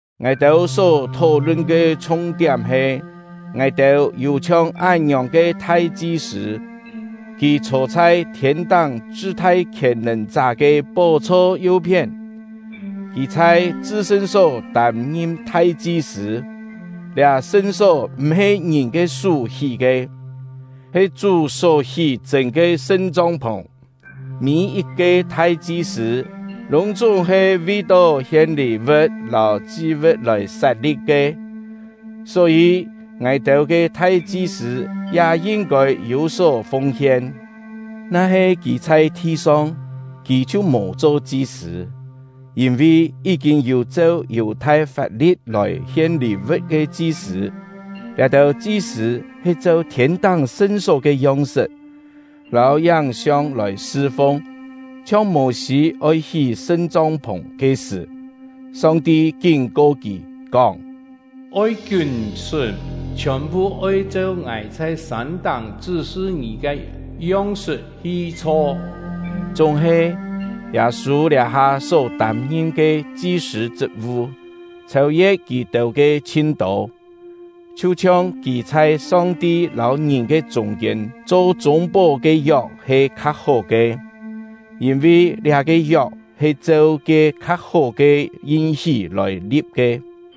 Ngài-têu só thó-lun ke chhung-tiám he: Ngài-têu yû chhiong án-ngiòng ke thai-chi-sṳ̂; kì chhô chhai thiên-táng chṳ-thai Khièn-nèn-chá ke pó-chho yu-phién. Kì chhai chṳ-sṳn-só tâm-ngim thai-chi-sṳ̂; liá sṳn-só m̀-he ngìn ke sú hí ke, he Chú só hí chṳ̂n ke sṳn-chong-phùng. Mî-yit-ke thai-chi-sṳ̂ lûng-chúng he vi-tó hien lî-vu̍t lâu chi-vu̍t lòi sat-li̍p ke; só-yî, ngài-têu ke thai-chi-sṳ̂ ya yin-kôi yû-só fung-hien. Na-he kì chhai thi-song, kì chhiu mò cho chi-sṳ̂, yîn-vi yí-kîn yû cheu Yù-thai fap-li̍t lòi hien lî-vu̍t ke chi-sṳ̂. Liá-têu chi-sṳ̂ he cheu thiên-táng sṳn-só ke yong-sṳt lâu yáng-siong lòi sṳ-fung. Chhiong Mô-sî oi hí sṳn-chong-phùng ke sṳ̀, Song-ti kín-ko kì, kóng: “Oi kiún-sṳ́m, chhiòn-phu oi cheu Ngài chhai sân-táng chṳ́-sṳ ngì ke yong-sṳt hi chho.” Chúng-he, Yâ-sû liá-ha só tâm-ngim ke chi-sṳ̂ chṳt-vu chhêu-ye̍t kì-têu ke chhin tô, chhiu-chhiong kì chhai Song-ti lâu ngìn ke chûng-kiên cho chûng-pó ke yok he kha-hó ke, yîn-vi liá-ke yok he cheu ke kha-hó ke yin-hí lòi li̍p ke.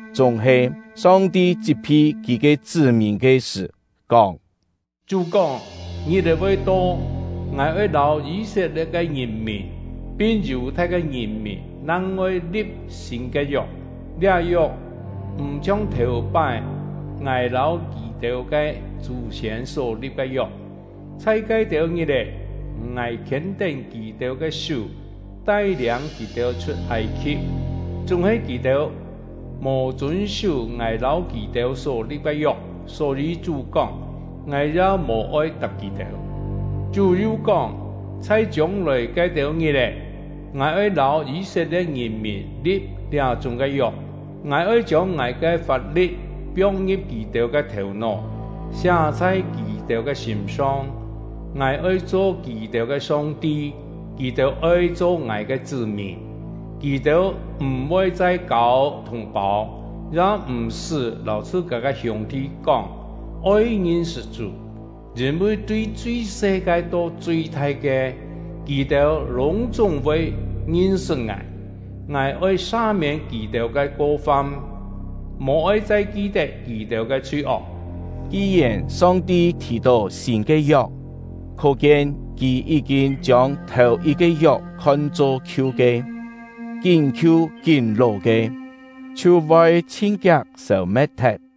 Chúng-he Song-ti chit-phi Kì ke chṳ́-mìn ke sṳ̀, kóng: Chú kóng: Ngit-è voi to, Ngài oi lâu Yî-set-lie̍t ke ngìn-mìn pin Yù-thai ke ngìn-mìn nang-ngoi li̍p sîn ke yok. Liá yok m̀ chhiong thèu-pái Ngài lâu kì-têu ke chú-siên só-li̍p ke yok; chhai ke-têu ngit-è Ngài khiên-tén kì-têu ke sú, tai-liâng kì-têu chhut Âi-khi̍p. Chúng-he kì-têu mò chûn-sú Ngài lâu kì-têu só-li̍p ke yok. Só-yî Chú kóng: Ngài ya mò-oi tap kì-têu. Chú yu kóng: Chhai chiông-lòi ke-têu ngit-è, Ngài oi lâu Yî-set-lie̍t ngìn-mìn li̍p liá-chúng ke yok: Ngài oi chiông Ngài ke fap-li̍t piong-ngi̍p kì-têu ke thèu-nó, siá chhai kì-têu ke sîm-song. Ngài oi cho kì-têu ke Song-ti, kì-têu oi cho Ngài ke chṳ́-mìn. Kì-têu m̀-voi chai kâu thùng-pâu, ya m̀-sṳ́ lâu chhṳ-kâ ke hiûng-thi kóng: “Oi ngin-sṳt Chú”; yîn-vi tui chui-se ke to chui-thai ke, kì-têu lûng-chúng voi ngin-sṳt Ngài. Ngài oi sa-miên kì-têu ke ko-fam, mò-oi chai ki-tet kì-têu ke chhui-ok. Ki-yèn Song-ti thì-tó “sîn ke yok”, khó-kien Kì yí-kîn chiông thèu-yit-ke yok khon-cho khiu ke. Kín khiu kín ló ke, chhiu voi chhin kiak sêu-me̍t-thet.